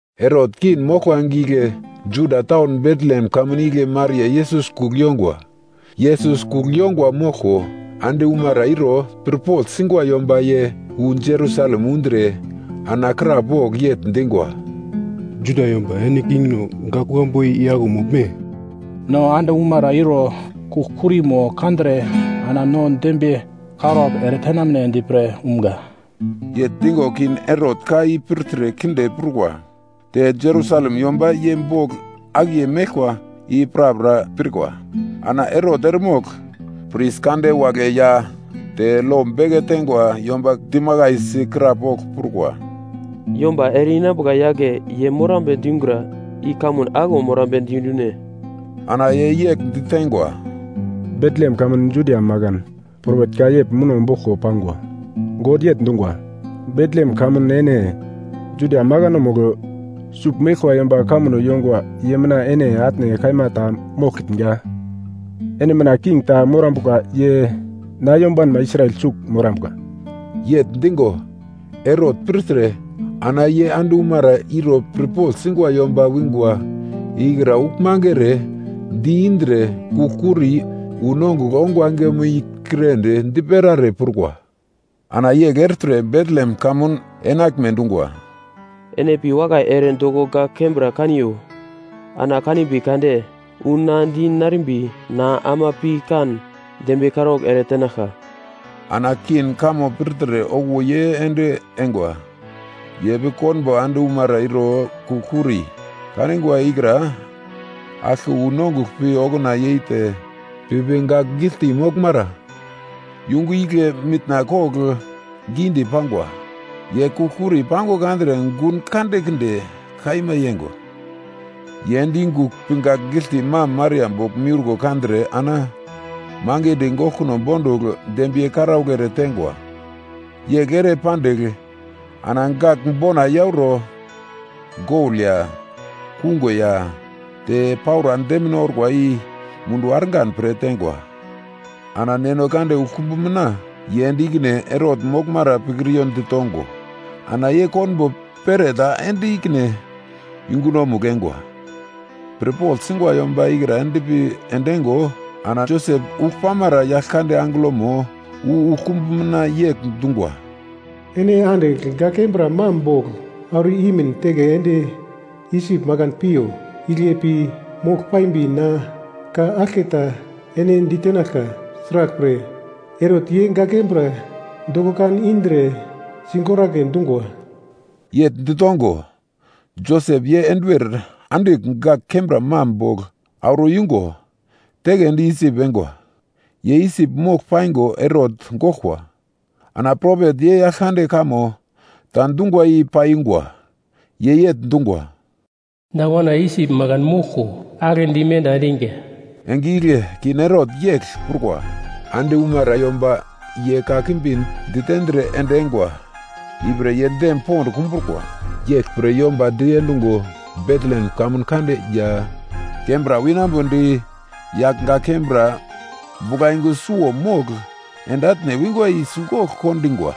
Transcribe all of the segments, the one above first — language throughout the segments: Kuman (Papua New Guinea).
Herot king moglkwa enge igle Judia taun Betlehem kamun igle Maria Yesus kugl yongwa. Yesus kugl yongwa moglko, ande umara iro pirpogl singwa yomba ye wu Jerusalem undre ana krapogl yegl dingwa, “Juda yomba ene kingno, gak kuglambu i aglo moglme? No ande umara iro kugl-kurimo kandre, ana no dembiye karaugl ere tenamnedi pre umga.” Yegl digo King Herot ka i pirtre kinde prukwa, te Jerusalem yomba ye bogl akiye meglkwa i prapra pirkwa. Ana Herot eremogl pris kande wagle ya te lo beke teingwa yomba dimakaisi krapogl prukwa, “Yomba ere-inambuka yagle ye morambe dingura i kamun aglo morambedi dune?” Ana ye yegl diteingwa, “Betlehem kamun Judia makan. Propet ka yegl muno boglko pangwa. God yegl dungwa, “‘Betlehem kamun ene, Juda makanomugl, sugl meglkwa yomba kamuno yongwa ye mina ene atne kaima ta moglkitnga. Ene mina king ta morambuka ye na yombanma Israel sugl morambuka.’” Yegl digo Herot pirtre ana ye ande umara iro pirpogl singwa yomba wingwa ikra uglmange ere di-indre kugl-kuri wu nongugl ongwa engemo i kirendi dipera ere prukwa. Ana yegl ertre Betlehem kamun enaglme dungwa, “Ene pi wakai ere doko gak kembra kaniyo, ana kanimbi kade wu na di narimbi na ama pi kan dembiye karaugl eretenaglka.” Ana king kamo pirtre okuwo ye ende eingwa, ye pi konbo ande umara iro kugl-kuri kanigwa ikra aglke wu nongugl pi okuna yeite pipi gak giglte moglmara yungu igle mitna kogl gidi pangwa. Ye kugl-kuri pango kandre gun kandekinde kaima yeingwa. Ye ende yungugl pi gak giglte mam Maria bogl miurko kandre ana mangidi goglkuno bondugl dembiye karaugl ereteingwa. Yegl ere pandigl ana gagl bona yauro gol ya, kungo ya te paura demine orkwa i munduwo argan pre teingwa. Ana God uglkumbu mina ye ende ikine Herot moglmara pikriyo ditongo, ana ye konbo pereta ende ikine yungunomugl eingwa. Pirpogl singwa yomba ikra endpi endeingo, ana Josep ugl pamara Yaglkande angelomo wu uglkumbu mina yegl dungwa, “Ene andigl gak kembra mam bogl auro imin teke ende Isip makan piyo. Igle pi mogl paimbi na ka aglketa ene ditenaglka, sraglpre Herot ye gak kembra doko kan indre sigoragle dungwa.” Yegl ditongo, Josep ye enduwer andigl gak kembra mam bogl auro yungo, teke ende Isip eingwa. Ye Isip mogl paingo Herot goglkwa. Ana propet ye Yaglkande kamo ta dungwa i paiyungwa. Ye yegl dungwa, “Na wana Isip makan moglko aglendi menda endiga.” Enge igle King Herot yegl prukwa, ande umara yomba ye kakimbi ditendre ende eingwa ipre ye dem pond kumbrukwa. Yeglpre yomba diendungo Betlehem kamun kande ya kembra winambodi yagl gak kembra buglayungu suwo mogl ende atne wingwa i sigogl kondingwa.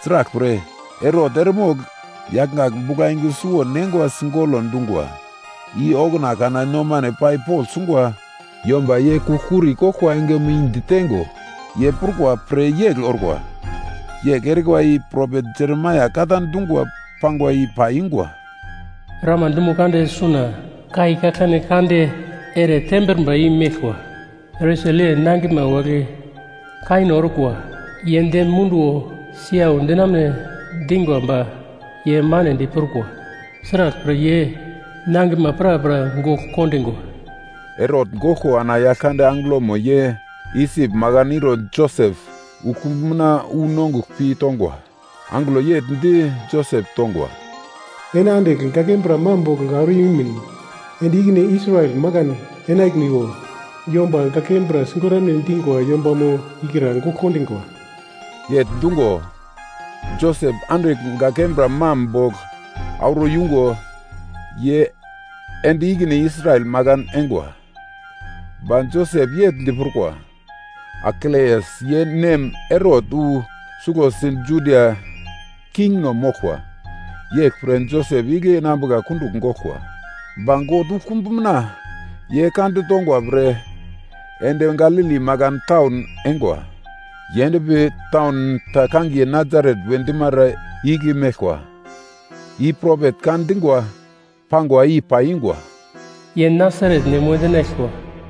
Sraglpre, Herot eremogl yagl gak buglayungu suwo neingwa sigolo dungwa i okuna kana nomano pai pogl sungwa yomba ye kugl-kuri koglkwa engemo i ditengo ye prukwa pre yegl orkwa. Yegl erikwa i propet Jeremaia ka ta dungwa pangwa i paiyungwa: “Rama dumo kande suna kai kaglkane kande ere tembrumba yei meglkwa. Resel ye nangiglma wagle kaino orkwa, ye dem munduwo siyau dinamune dingwa ba ye manedi prukwa, sraglpre, ye nangiglma prapra gogl kondingwa.” Herot goglko ana Yaglkande angelomo ye Isip makan iro Josep uglkumbu mina wu nongugl pi tongwa. Angelo yegl di Josep tongwa, “Ene andigl gak kembra mam bogl auro imin ende ikine Israel makan enaglmiwo. Yomba gak kembra sigoramune dingwa yombamo ikra gogl kondingwa.” Yegl dungo, Josep andigl gak kembra mam bogl auro yungo ye ende ikine Israel makan eingwa. Ba Josep yegl di prukwa. Arkeleas ye nem Herot wu suglosi Judia kingno moglkwa yeglpre Josep igle enambuka kundugl goglkwa. Ba God uglkumbu mina ye ka ditongwa pre ende Galili makan taun eingwa. Ye endpi taun ta kangiye Nasaret we dimara igle meglkwa. I propet ka dingwa pangwa i paiyungwa, “Ye Nasaret nem we dinaglkwa.”